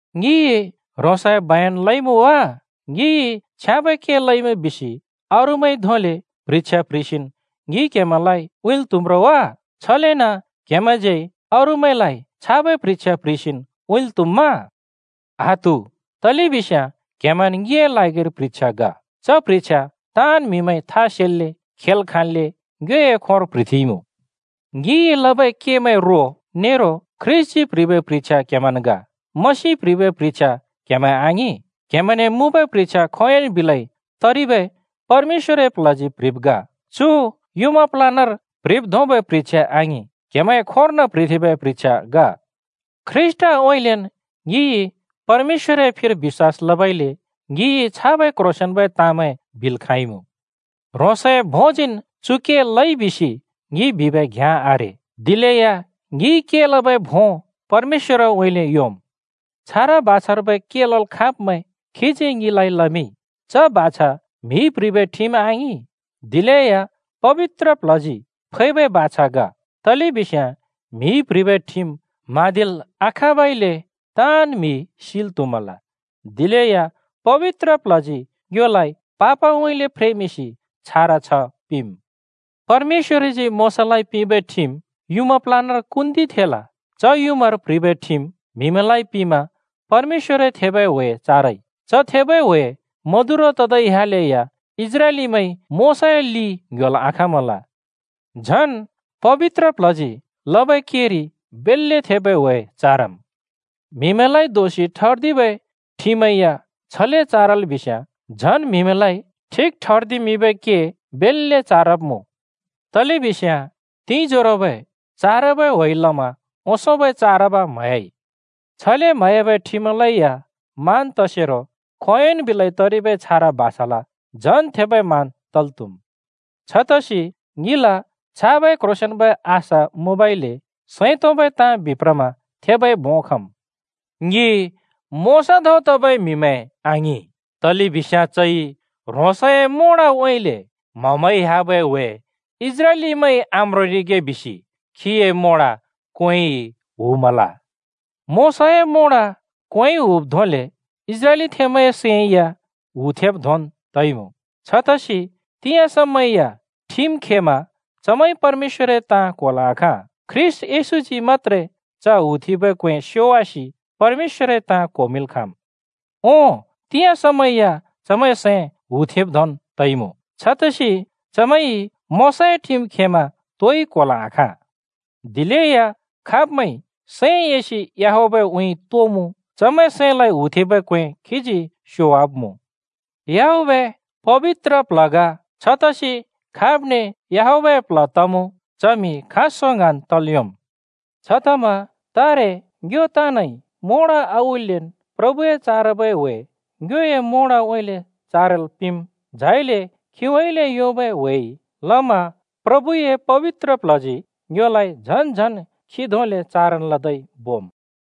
ङिइ ह्रोंसए बयन लइमुँ वा? ङिइ “छ्याँबै के लइमुँ” बिसि अरूमैंइ धोंले प्ह्रिछ्या प्ह्रिसिन् ङिइ क्‍हेमैंलाइ उँइँल् त्‍हुम्‌ रो वा? छलेन क्‍हेमैंज्यै अरूमैंलाइ छाबै प्ह्रिछ्या प्ह्रिसिन् उँइँल् त्‍हुम्मा? आत्‍हु! तलेबिस्याँ क्हेमैंन् ङिए ल्हागिर प्ह्रिछ्या ग। च प्ह्रिछ्या ताँन् म्हिमैंइ था सेल्‍ले, खेल् खाँल्‍ले ङ्योए खोंर प्ह्रिथेंइमुँ। ङिइ लबै केमैंए रो नेरो ख्रीष्‍टजी प्‍ह्रिबै प्ह्रिछ्या क्‍हेमैंन् ग। मसिइ प्‍ह्रिबै प्ह्रिछ्या क्हेमैं आङिं, क्हेमैंने मुँबै प्ह्रिछ्या खोंयोंन् बिलै तरिबै परमेश्‍वरए प्ल्हजी प्‍ह्रिब् ग। चु युँमा प्‍लानर प्ह्रिब् धोंबै प्ह्रिछ्या आङिं, क्‍हेमैंए खोंर्न प्‍ह्रिथेंबै प्ह्रिछ्या ग। ख्रीष्‍टउँइँलेन् ङिइ परमेश्‍वरए फिर बिश्‍वास लबइले ङिइ छाबै क्ह्रोंसेंन्बै ताँमैं बिल् खाँइमुँ। ह्रोंसए भोंजीन् चु के लइ बिसि ङिइ बिबै घ्याँ आरे, दिलेया ङिइ के लबै भों परमेश्‍वरउँइँले योंम्। छारा बाछार्बै के लल् खाँब्मैं खीजी ङिलाइ लमिंइ। च बाछा म्‍हिइ प्‍ह्रिबै ठिम आङिं, दिलेया पबित्र प्ल्हजी फैबै बाछा ग। तलेबिस्याँ म्‍हिइ प्ह्रिबै ठिम म्हाँदिल् आखाँबइले ताँन् म्‍हि सिल् त्‍हुमल, दिलेया पबित्र प्ल्हजी ङ्योलाइ पापउँइँले फ्रेमिंसि छारा छ्ह पिंम्। परमेश्‍वरजी मोशालाइ पिंबै ठिम युँमा प्‍लानर कुन्दिथेंल। च युँमार प्‍ह्रिबै ठिम म्‍हिमैंलाइ पिंमा परमेश्‍वरए थेबै ह्‍वे चारइ। च थेबै ह्‍वे मदुरो तदै ह्‍यालेया इस्राएलीमैंइ मोशाए लि ङ्ह्‍योल् आखाँमल। झन् पबित्र प्ल्हजी लबै केरि बेल्‍ले थेबै ह्‍वे चारम्। म्हिमैंलाइ दोषि ठर्दिबै ठिमै या छले चारल बिस्याँ, झन् म्हिमैंलाइ ठिक ठर्दिमिंबै के बेल्‍ले चारब्मुँ। तलेबिस्याँ तिंजोरोबै चारबै ह्‍वेइ लमा ओंसोंबै चारब म्हह्‍याइ। छले म्हह्‍याबै ठिमलै या मान तसेरो खोंयोंन् बिलै तरिबै छारा बाछाल झन् थेबै मान तल् त्हुम्। छतसि ङिल छाबै क्ह्रोंसेंन्बै आशा मुँबइले सैं तोंबै ताँ बिप्रमा थेबै भों खम्। ङि मोशा धों तबै म्‍हिमैं आङिं, तलेबिस्याँ चइ ह्रोंसए मोंडउँइँले म्ह‍-म्हइ ह्‍याबै ह्‍वे इस्राएलीमैंइ आम्रोंरिगे बिसि खीए मोंड क्‍वेंइ हुमल। मोशाए मोंड क्वेंइ हुब् धोंले इस्राएलथेंमैंए सैं या हुथेंब् धोंन् तइमुँ। छतसि तिंयाँ समै या ठिम खेमा चमैंइ परमेश्‍वरए ताँ क्‍होल् आखाँ। ख्रीष्‍ट येशूजी मत्‍त्रे च हुथेंबै क्‍वें स्‍योवासि परमेश्‍वरए ताँ क्होमिंल् खाँम्। ओं, तिंयाँ समै या चमैंए सैं हुथेंब् धोंन् तइमुँ। छतसि चमैंइ मोशाए ठिम खेमा तोइ क्‍होल् आखाँ। दिलेया खाब्मैंइ सैं एसि याहवेहउँइँ तोमुँ चमैंए सैंलाइ हुथेंबै क्‍वें खीजी स्‍योवाब्मुँ। “याहवेह” पबित्र प्ल्ह ग, छतसि खाब्ने याहवेहए प्ल्ह तमुँ, च म्‍हि खाँसों ङ्हाँन् तल् योंम्। छतमा तारे ङ्यो ताँनइ मोंड आउल्‍लेन् प्रभुए चारबै ह्‍वे ङ्योए मोंडउँइँले चारल् पिंम्। झाइले खीउँइँले योंबै ह्‍वेइ लमा प्रभुजी अथवा पबित्र प्ल्हजी ङ्योलाइ झन् झन् खी धोंले चारब लदै बोम्।